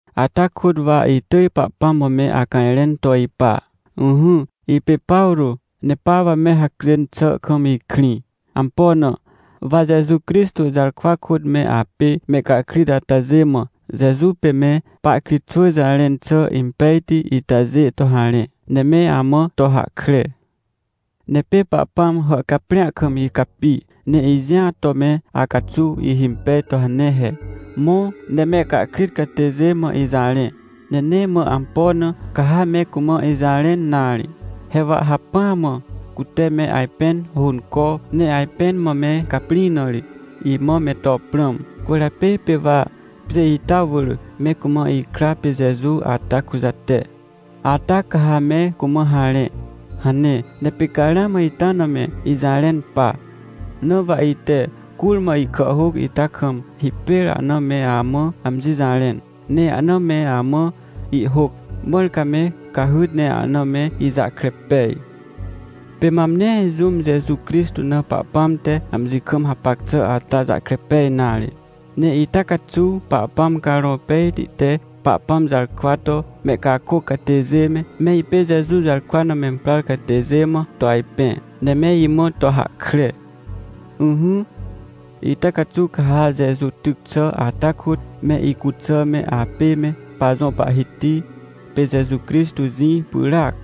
Ata kôt wa itỳj Pahpãm mã me acajrẽn to ipa. Ỹhỹ, ipê Pawrô, ne pa wa me hacjên xà kam ikrĩ. Ampo na? Wa Jeju Crixtô jarkwa kôt me apê mehcahkrit atajê mã Jeju pê me pahkritxwỳ jarẽn xà impejti itajê to harẽ, ne me amã to hahkre. Ne pê Pahpãm hàhcaprĩa kam icapi, ne ijĩa to me acaxuw ihhimpej to hane he: — Mõ, ne mehcahkrit catêjê mã ijarẽ. Ne nee mã ampo na, ca ha me cumã ijarẽn nare. He wa hacpỹa mã cute me ajpẽn hônco, ne ajpẽn mã me caprĩ na ri, imã me to prãm. Cwỳrjapê pê wa pjê ita wỳr me cumã ikra pê Jeju ata kujate. Ata ca ha me cumã harẽ — hane. Ne pê ca ramã ita na me ijarẽn pa. Na wa ite curmã ihkàhhôc ita kam hipêr ahna me amã amji jarẽn, ne ahna me amã ihhôc, mãr ca me cahyt ne ahna me ijahkre pej. Pê mam nee jũm Jeju Crixtô na Pahpãm te amji kam hapac xà ata jahkre pej nare. Ne ita caxuw Pahpãm Carõ Pejti te Pahpãm jarkwa to mehcakôc catêjê me, me ipê Jeju jarkwa na memprar catêjê mã to ajpẽ, ne me imã to hahkre. Ỹhỹ, ita caxuw ca ha Jeju tyc xà ata kôt, me icuxà me apê me pajõ Pahhiti pê Jeju Crixtô jĩ pyràac.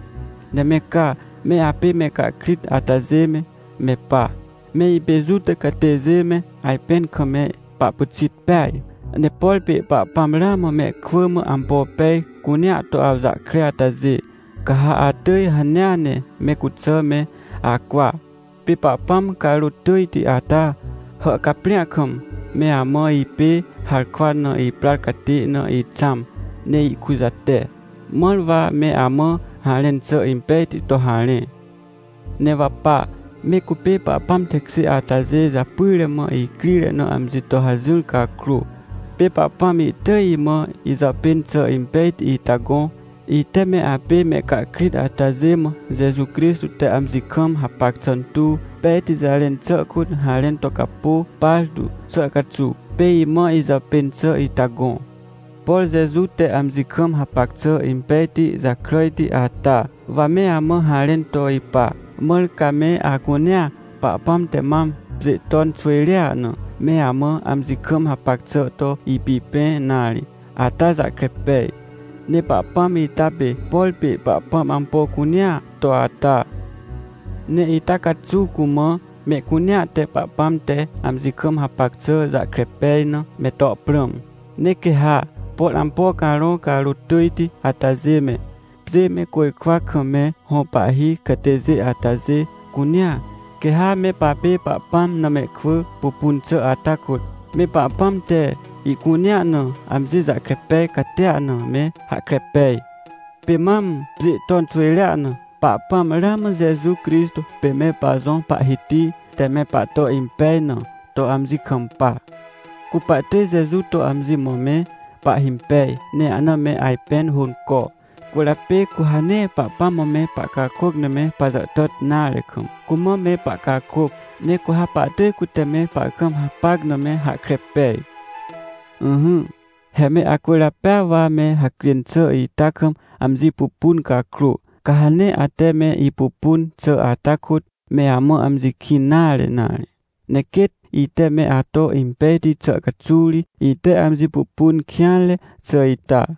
Ne me ca, me apê mehcahkrit atajê me, me pa, me ipê Juta catêjê me, ajpẽn kam me pahpyxit peaj. Ne por pê Pahpãm ramã mehkwỳ mã ampo pej cunea to awjahkre atajê, ca ha atỳj hanea ne me cuxà me acwa. Pê Pahpãm carôt tỳjti ata hàhcaprĩa kam, me amã ipê harkwa na iprar catê na ixãm ne ikujate, mãr wa me amã harẽn xà impejti to harẽ. Ne wa pa, me cupê Pahpãm tekjê atajê japyre mã icrire na amji to hajỹr cakrô, pê Pahpãm ihtỳj imã ijàpên xà impejti ita gõ. Ite me apê mehcahkrit atajê mã Jeju Crixtô te amji kam hapac xà tuw pejti jarẽn xà kôt harẽn to capô partu xà caxuw, pê imã ijàpên xà ita gõ. Por Jeju te amji kam hapac xà impejti jakràjti ata, wa me amã harẽn to ipa. Mãr ca me acunea Pahpãm te mam pjê ton xwỳjrea na, me amã amji kam hapac xà to ipipẽ nare ata jahkre pej. Ne Pahpãm ita pê, por pê Pahpãm ampo cunea to ata. Ne ita caxuw cumã, mehcunea te Pahpãm te amji kam hapac xà jahkre pej na, me to prãm. Ne quê ha, por ampo carõ carôt tỳjti atajê me, pjê me côjkwa kam me hõ pahhi catêjê atajê cunea, quê ha me papê Pahpãm na mehkwỳ pupun xà ata kôt, me Pahpãm te ihcunea na amji jahkre pej catia na me hahkre pej. Pê mam, pjê ton xwỳjrea na, Pahpãm ramã Jeju Crixtô pê me pajõ Pahhiti te me pahto impej na to amji kampa. Cu pahtỳj Jeju to amji mã me pahhimpej, ne ahna me ajpẽn hônco. Cwỳrjapê cu ha nee Pahpãm mã me pahcakôc na me pajàhtàt nare kam, cumã me pahcakôc. Ne cu ha pahtỳj cute me pahkam hapac na me hahkre pej. Ỹhỹ, he me acwỳrjapêa wa me hacjên xà ita kam amji pupun cakrô, ca ha nee ate me ipupun xà ata kôt me amã amji kĩn nare nare. Ne quêt ite me ato impejti xà caxuw ri, ite amji pupun kêanre xà ita.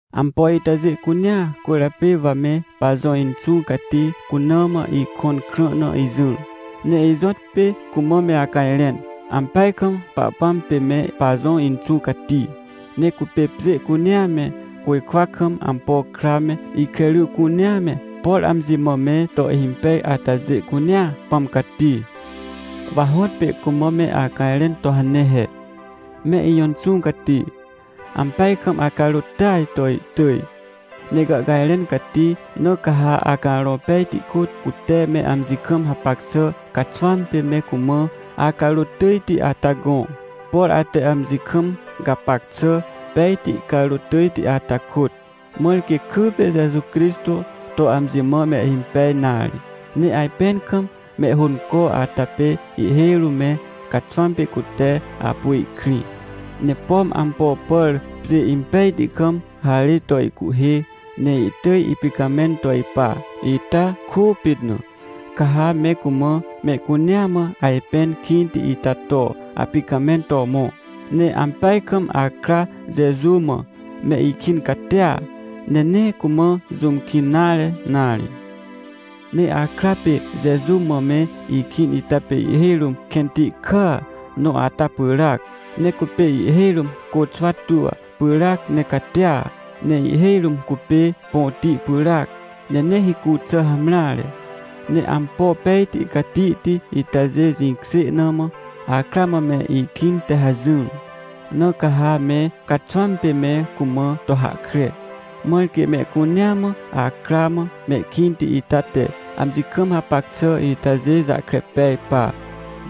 Ampo itajê cunea cwỳrjapê wa me pajõ Inxũ Cati cuna mã ikõn krã na ijỹr, ne ijõtpê cumã me acajrẽn. Ampeaj kam Pahpãm pê me pajõ Inxũ Cati. Ne cupê pjê cunea me, côjkwa kam ampo kra me, ikre ry cunea me, por amji mã me to ihhimpej atajê cunea Pãm Cati. Wa hõtpê cumã me acajrẽn to hane he: — Me ijõ Inxũ Cati, ampeaj kam acarôt tỳaj to ihtỳj, ne gàhcajrẽn cati. Na ca ha Acarõ Pejti kôt, cute me amji kam hapac xà caxwãm pê me cumã acarôt tỳjti ata gõ, por ate amji kam gapac xà pejti carôt tỳjti ata kôt. Mãr quê kypê Jeju Crixtô to amji mã mehhimpej nare. Ne ajpẽn kam mehhônco ata pê ihhêj rũm me caxwãm pê cute apu ihkrĩ. Ne pom ampo pàr pjê impejti kam harê to ihcuhhê, ne ihtỳj ipicamẽn to ipa, ita kôpit na, ca ha me cumã mehcunea mã ajpẽn kĩnti ita to apicamẽn to mõ. Ne ampeaj kam akra Jeju mã me ikĩn catia, ne nee cumã jũm kĩn nare nare. — Ne akra pê Jeju mã me ikĩn ita pê ihhêj rũm kẽnti kàa nõ ata pyràac, ne cupê ihhêj rũm côxwa tua pyràac ne catia, ne ihhêj rũm cupê põti pyràac, ne nee hicu xà hamreare. Ne ampo pejti catihti itajê jĩkjê na mã, akra mã me ikĩn te hajỹr. Na ca ha me caxwãm pê me cumã to hahkre, mãr quê mehcunea mã akra mã mehkĩnti ita te, amji kam hapac xà itajê jahkre pej pa.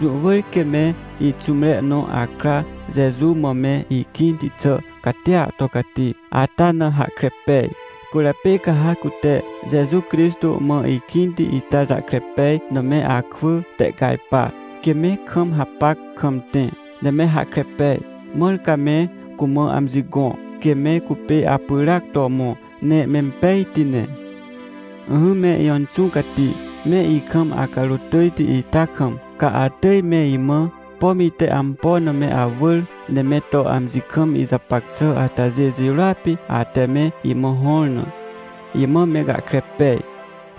— Jũ wỳr quê me ixũmre nõ akra Jeju mã me ikĩnti xà catia to cati ata na hahkre pej, cwỳrjapê ca ha cute Jeju Crixtô mã ikĩnti itajahkre pej na me akwỳ tehcajpa, quê me kam hapac kam tẽ, ne me hahkre pej. Mãr ca me cumã amji gõ, quê me cupê apyràac to mõ, ne mempejti ne. — Ỹhỹ me ijõ Inxũ Cati, me ikam acarôt tỳjti ita kam, ca atỳj me imã, pom ite ampo na me awỳr, ne me to amji kam ijapac xà atajê jirôa pê ate me imã hõr na, imã me gahkre pej.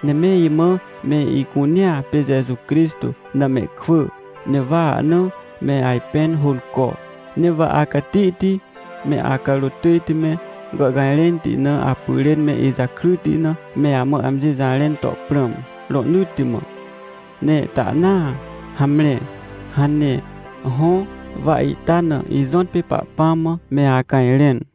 Ne me imã me icunea pê Jeju Crixtô na mehkwỳ, ne wa ahna me ajpẽn hônco. Ne wa acatihti me acarôt tỳjti me, gàhcajrẽnti na apyrên me ijakryti na, me amã amji jarẽn to prãm, rohnỳtti mã. Ne tahnaa, hamre — hane. Hõ, wa ita na ijõtpê Pahpãm mã me acajrẽn.